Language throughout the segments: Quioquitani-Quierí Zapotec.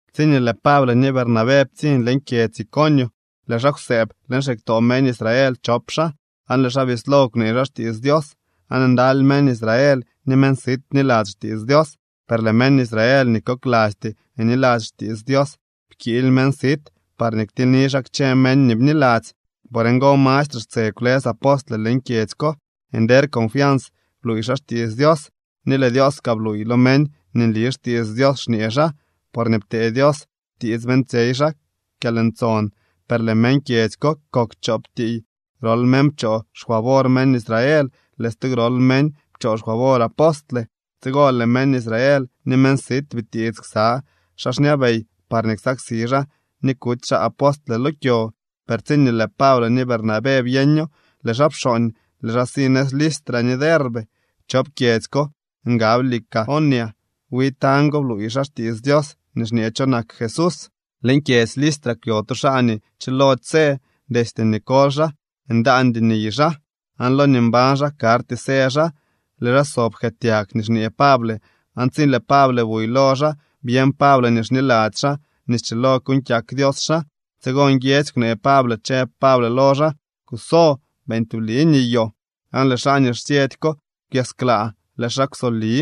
Tsiñee lëë Pable ni Bernabé ptsiñ leñ kyedzy Iconio lëë xaa kwsëëb leñ xiktoo meñ Israel chop xaa, aan lëë xaa bislo kwnee xaa xtiits Dios, aan ndaly meñ Israel ni meñ sit bniladzy xtiits Dios. Per lëë meñ Israel nii koklasty niladzy xtiits Dios pkiily meñ sit parñee ktilyni xaa kchë meñ nii bniladzy. Por ngo mastre xtse kwlës apostle leñ kyedzy ko. Nder confians bluuy xaa xtiits Dios, ni lëë Dios kaa bluuy lo meñ nii nli xtiits Dios xñee xaa, porñee ptee Dios tiits beeñtsyey xaa kyalntson. Per lëë meñ kyedzy ko kok chop tiiy. Grol meñ pchoo xfavor meñ Israel, lëë stu grol meñ pchoo xfavor apostle. Tsigo lëë meñ Israel ni meñ sit bitiits ksa xaa xñabey parñee ksaksi xaa ni kuty xaa apostle lo kyo. Per tsiñee lëë Pable ni Bernabé byeño, lëë xaa pxooñ, lëë xaa si nëz Listra ni Derbe. Chop kyedzy ko ngab Licaonia. Wi tañ go bluuy xaa xtiits Dios nii xñee cho nak Jesús. Leñ kyedzy Listra kwyo tu xaa nii chilody së. Destye nii koly xaa ndaandy niy xaa, aan lo nii mbañ xaa karty së xaa. Lëë xaa sob jkëëtyag nii xñee Pable aan tsi lëë Pable buy lo xaa byeñ Pable nii xniladzy xaa nii schilo kuuñ kyak Dios xaa. Tsigo nguiedzy kwnee Pable, chëb Pable lo xaa: —Kuso, beeñ tubli niyoo. Aan lëë xaa nii xsyëdy ko kwyasklaa, lëë xaa kwsoli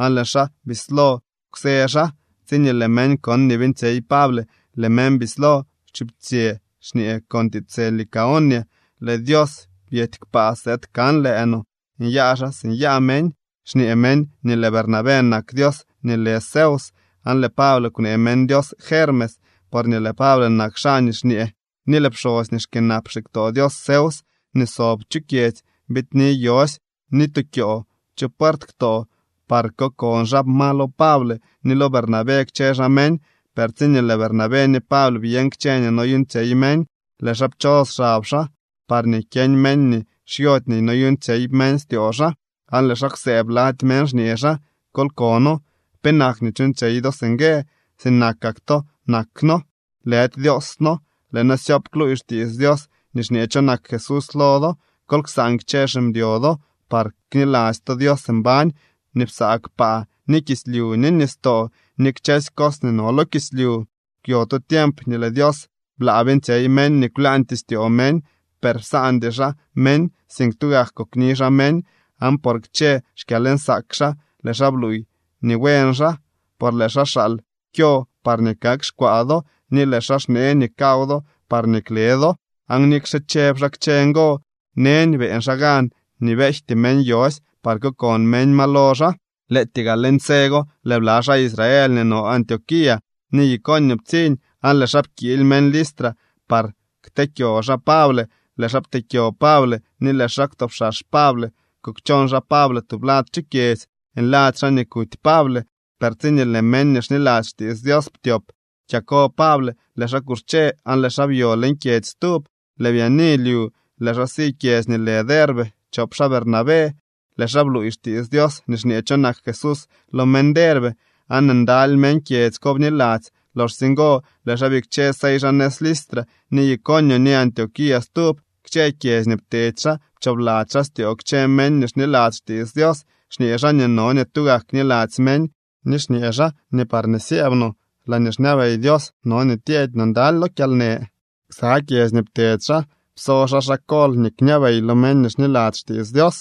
aan lëë xaa bislo kwsë xaa. Tsiñee lëë meñ kon nii beeñtsyey Pable, lëë meñ bislo chuptsyë xñee con tiitsë Licaonia: —¡Lëë dios byety kpaa sëëd kan lëë no! ¡Nyaa xaa si nyaa meñ! Xñee meñ nii lëë Bernabé nak dios nii lë Zeus aan lëë Pable kwnee meñ dios Hermes, porñee lëë Pable nak xaa nii xñee. Ni lëë pxosy nii xkyënap xiktoo dios Zeus nii sob chu kyedzy biidni yosy ni tukyoo chu puert ktoo par kokon xaa ma lo Pable ni lo Bernabé kchë xaa meñ. Per tsiñee lëë Bernabé ni Pable byeñ kchë nii noyuuñtsyey meñ, lëë xaa pchos xab xaa parñee kyeñ meñ nii xyody nii noyuuñtsyey meñ styoo xaa, aan lëë xaa kwsëëb lady meñ xñee xaa: —¡Kol kono! ¿Penak nii chuuñtsyey do singue? Sinakak to nak noo, lëdy dioos noo. Lëë noo syoop kluuy xtiits Dios nii xñee cho nak Jesús lo do. Kol ksaan kchë ximdyo do par kniladzy to Dios mbañ nii psaa kpaa ni kislyu ni nistoo ni kchësy cos nii no lo kislyu. Kwyo tu tiemp nii lëë Dios blaa beeñtsyey meñ nii kwlaañtyee styoo meñ. Per psaandy xaa meñ, sink tugak kokni xaa meñ, aan por kchë xkyalnsaak xaa lëë xaa bluuy nii buen xaa. Por lëë xaa xaal kyo parñee kak xkwaa do ni lëë xaa xnee nii kaw do parñee kle do. Aan nikxe chëb xaa kchë ngo, neñ beeñ xaa gan nii beejty meñ yosy par kokon meñ ma lo xaa. Lëëtyee gaa leñ tse go lëë bla xaa Israel nii no Antioquía ni Iconio ptsiñ, aan lëë xaa pkiily meñ Listra par kteekyo xaa Pable. Lëë xaa pteekyo Pable ni lëë xaa kwtopxax Pable, kukchon xaa Pable tublad chu kyedzy, nladzy xaa nii kuty Pable. Per tsiñee lëë meñ nii xniladzy xtiits Dios ptyop kyako Pable, lëë xaa kuxche aan lëë xaa byo leñ kyedzy stub. Lëë byaani lyu, lëë xaa si kyedzy nii lë Derbe chop xaa Bernabé. Lëë xaa bluuy xtiits Dios nii xñee cho nak Jesús lo meñ Derbe, aan ndaly meñ kyedzy ko bniladzy. Loxsye ngo lëë xaa bikche sey xaa nëz Listra ni Iconio ni Antioquía stub. Kchë kyedzy nii ptedy xaa pchoobladzy xaa styoo kchë meñ nii xniladzy xtiits Dios, xñee xaa nii no nii tugak kniladzy meñ, ni xñee xaa nii parñee syëëb no laañee xñabey Dios no nii tyeedy no ndaly lo kyalnë. Ksa kyedzy nii ptedy xaa pso xaa xaa kol nii kñabey lo meñ nii xniladzy xtiits Dios.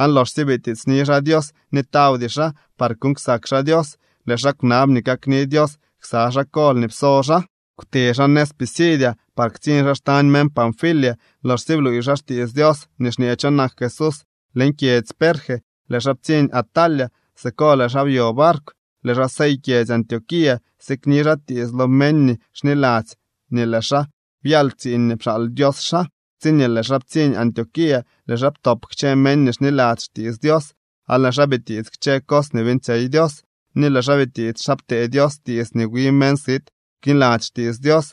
Aan loxsye bitiitsni xaa Dios ni tawdy xaa par kuuñ ksak xaa Dios, lëë xaa kwnab nii kakni Dios ksa xaa kol nii pso xaa. Kwte xaa nëz Pisidia par ktsiñ xaa xtañ meñ Panfilia. Loxsye bluuy xaa xtiits Dios nii xñee cho nak Jesús leñ kyedzy Perge, lëë xaa ptsiñ Atalia. Siko lëë xaa byo barkw, lëë xaa sey kyedzy Antioquía, sikni xaa tiits lo meñ nii xniladzy nii lëë xaa byal tsiiñ nii pxaal Dios xaa. Tsiñee lëë xaa ptsiñ Antioquía, lëë xaa ptop kchë meñ nii xniladzy xtiits Dios aan lëë xaa bitiits kchë cos nii beeñtsyey Dios, ni lëë xaa bitiits xa ptee Dios tiits nii wi meñ sit kniladzy xtiits Dios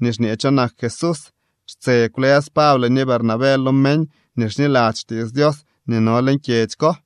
nii xñee cho nak Jesús. Xtse kwlës Pable ni Bernabé lo meñ nii xniladzy xtiits Dios nii no leñ kyedzy ko.